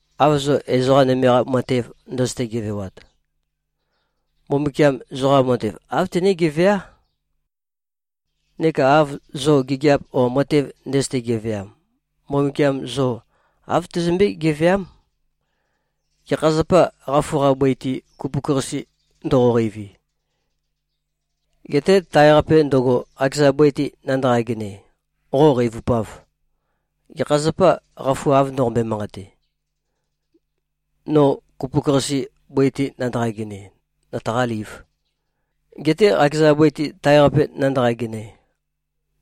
Av zo ezoqa nøme-qa matev ndøzøte-gevewat, Mbumbukiam zoqa matev āv tené-geveá. Neka av zo gigiap o matev ndøzøte-geveam, Mbumbukiam zo āv tezømbé-geveám. Gekha zapâ, qafu-qa bøi-te kupuk-qase ndoqoqeivi, getē tae-qape ndøgo, qakeza bøi-te nandaqa-genøe, qo qeivupāv? Gekha zapâ, qafu av ndoqombøe-manqate, ‘No kupuk-qase, bøi-te nandaqa-genøe, nøtaqālīv,’ getē qakeza bøi-te, tae-qape nandaqa-genøe?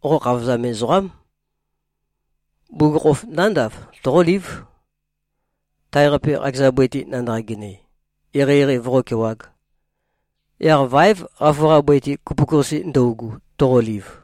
Qo khavozam ezoqám. Bugukhokhof nándav, toqólív, tae-qape, qakeza bøi-te nandaqa-genøe, eqeieqei voqókewāg. Yaq váev, qafu-qa bøi-te, kupuk-qase ndøugu, toqoliv.”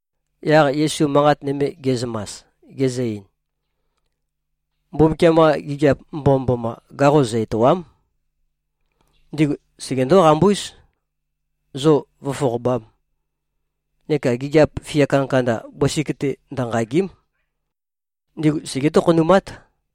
Yaq Yesu manqat nøme ge꞉zømas, gezø-ein, “Mbumbukiam-qa gigiap mbomømboma gaqo zø-ètoa᷄m. Ndigu segendó-qambúz, zo vǿfoqobām. Neka gigiap fia kandakanda bøsik-te ndønqàgi᷄m. Ndigu segé-tokhonumát.”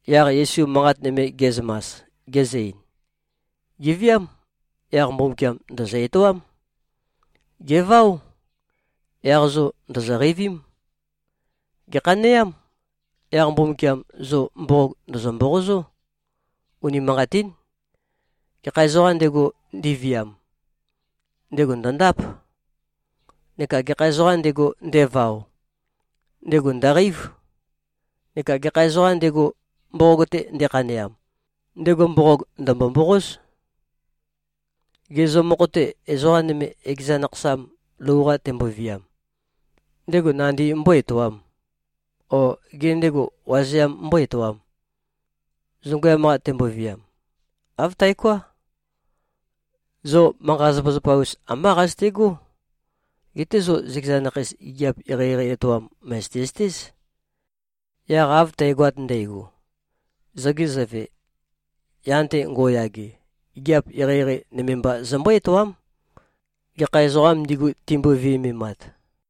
Yaq Yesu manqat nøme ge꞉zømas, gezø-ein, “Gèviám. Yaq Mbumbukiam ndø̀zø-etoám. Gèváo. Yaq zo ndòzo-qeivím. Gèkhaneám. Yaq Mbumbukiam zo mboqog ndø̀zø-mboqozó. Unimanqatín. Gekha ezoqām ndego, ndeviam, ndego ndø̀ndáp. Neka gekha ezoqām ndego, ndevao, ndego ndø̀qeív. Neka gekha ezoqām ndego, mboqog-te ndekhaneam, ndego mboqog ndø̀mbo-mboqóz. Gê, zo mokho-te, ezoqa nøme, ekeza nakhasam lou-qa temboviam, ndego nandi mbó-etoām? O gê, ndego wazeam mbó-etoām, zongøyam-qa temboviam? Āv taoká. Zo manqa-zapazapa-us ambá qazøtegó. Geté zo zøkeza nakheis, gigiap eqeieqei etoam mø̀zøte-zøtéz. Yaq av tægoat ndægo, zoge Zøve, yan-te ngo꞉yage, gigiap eqeieqei nøme mba zømbó-etoám, gekha ezoqām ndigu, timbo-viømemat.”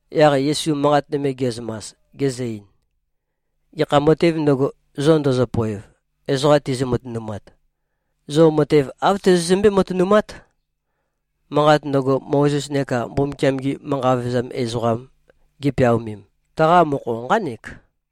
Yaq Yesu manqat nøme ge꞉zømas, gezø-ein, “Gekha matēv ndøgo, zo ndøzøpoev, ezoqa tizø-matønumat, zo matev āv tozozømbé-matønumát. Manqat ndøgo, Mozes neka Mbumbukiam-gi manqa vevezam ezoqam gipeaomem, taqa mokho nqánek.”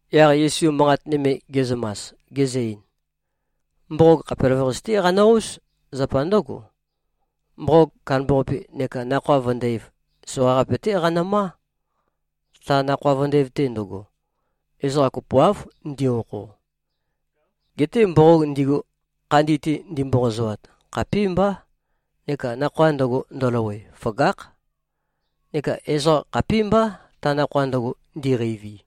Yaq Yesu manqat nøme ge꞉zømas, gezø-ein, “Mboqog khapelavøqasi-té qanø-óz. Zapa ndǿgo, mboqog kandambaqapi neka nakhoa vøndæv, soqaqape-té qanømá. Ta nakhoa vøndæv-te ndøgo, ezoqa kopoáv ndi-okho. Geté mboqog ndigu, khandi-te ndimboqozoat, khapímbá, neka nakhoa ndøgo ndøløwe, føgákh. Neka ezoqa khapímbá, ta nakhoa ndøgo ndiqeivi.”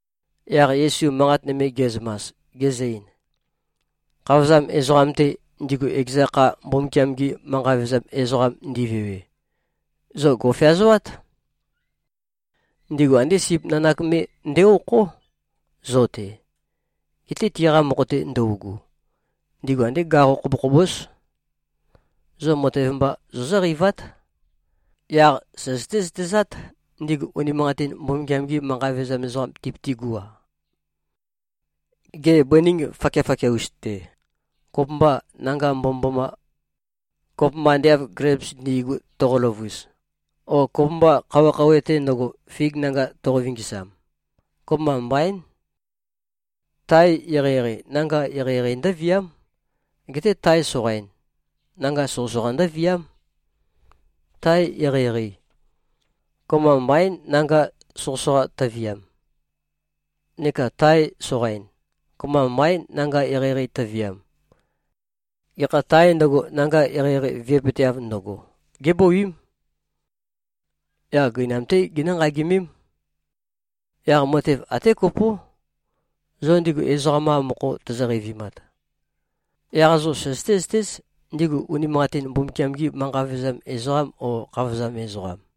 Yaq Yesu manqat nøme ge꞉zømas, gezø-ein, “Khavozam ezoqam-te, ndigu ekeza kha Mbumbukiam-gi manqa vevezam ezoqam ndivewe, zo gò꞉feazoát. Ndigu andé sip nanak me nde-okhó, zo-te. Geté tiqa mokho-te ndøugu, ndigu andé gaqo khobokhobós. Zo matev mba zozǿqeivát. Yaq søzøté-zøtezát, ndigu unimanqatin Mbumbukiam-gi manqa vevezam ezoqam tipøtigú-a. Gê, bøning fakiafakia-us-te, kopømbâ, nanga mbomømboma, kopømba ande av gleips ndi꞉gu, toqo-løvus? O kopømbâ, khouwe-khouwe-te ndøgo, fig nanga toqo-vingisam? Kopømba mbaín. Tae eqeieqei, nanga eqeieqei ndǿviám. Geté tae soqain, nanga soqøsoqa ndǿviám. Tae eqeieqei, kopømba mbaín, nanga soqøsoqa tøviam. Neka tae soqain, kopømba mbaín, nanga eqeieqei tøviam. Gekha tāe ndøgo, nanga eqeieqei vi꞉pøteav ndøgo, gébouím. Yaq gøinam-té ginǿ-nqagimém. Yaq matev até kopó. Zo ndigu ezoqam-qa mokho tozo-qeivimat, yaq zo søzøté-zøtéz, ndigu unimanqatin Mbumbukiam-gī manqa vevezam ezoqām, ó, khavozam ezoqām.”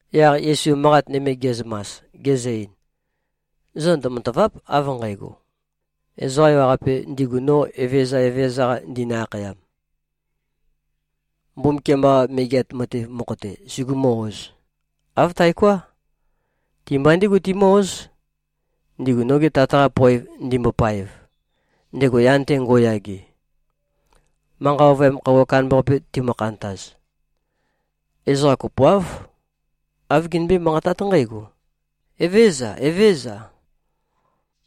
Yaq Yesu manqat nøme ge꞉zømas, gezø-ein, “Zo ndømatàva᷄p, av nqægo, ezoqa ewaqape ndigu no Evezøza Evezøza-qa ndinø-akhayam, Mbumbukiam-qa Megeat Matev mokho-te sugumū-ōz. Āv taoká. Ti-mba ndígu timǿ-óz, ndigu noge Tat-qa poev ndimbopaev, ndego yan-te ngo꞉yage. Manqa ovøyam khøuwa kandambaqape timø-khantaz, ezoqa kopoáv, āv ginømbé-manqatát nqǽgo, ‘Evézøza. Evézøza.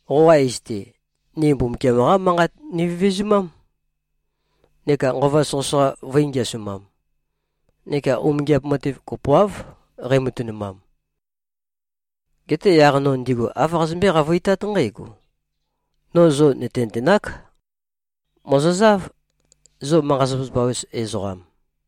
Qoqa iz-te, ni Mbumbukiam-qá Manqat nivevezumám, neka nqova soqøsoqa vø̄i-ngeasumam, neka umingiap matev kopoáv qeimatønumam.’ Geté yaq no ndigu āv qazømbé-qavøitát nqǽgo, ‘No zo nø̀tenøtenák. Mòzozáv, zo manqa-zapazapa-us ezoqam.’”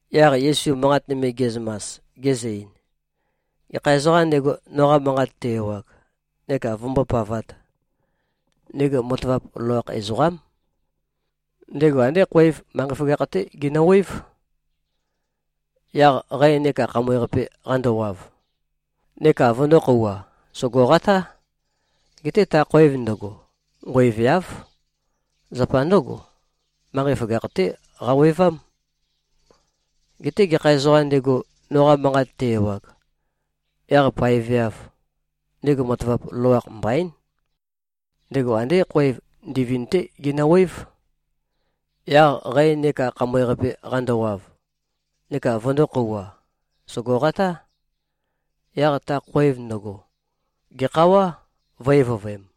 Yaq Yesu manqat nøme ge꞉zømas, gezø-ein, “Gekha ezoqām ndego, noqa manqat te-ewag neka vømbópavāt, ndego matavap loloakh ezoqám. Ndego andé khoev manqei føgakh-té genøwév. Yaq qæ neka khamøe-qape qandowav, neka vøndō-khouwa, sògoqatá. Geté ta khoev ndøgo nqoeveáv. Zapa ndǿgo, manqei føgakh-té qawevám. Geté gekha ezoqām ndego, noqa manqat te-ewag, yaq paeveāv, ndego matavap loloakh mbaín. Ndego andé khoev ndivind-té genøwév. Yaq qæ neka khamøe-qape qandowav, neka vøndō-khouwa, sògoqatá. Yaq ta khoev ndøgo gèkhawá, vø̄-evøvøem.”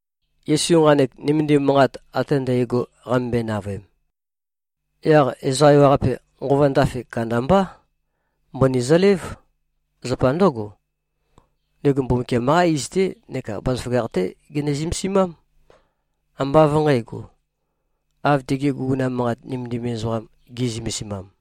Yesu nqanek nømendim manqat ate ndægo qamømbøe-navøem, yaq ezoqa ewaqape nqova ndafe kandambá. Mbøni zølév. Zapa ndǿgo, ndego Mbumbukiam-qá iz-té neka bazaføgakh-té gene-zømesimám. Ambá av nqǣgo, av tigi guguna manqat nømendim ezoqam gi꞉zømesimam.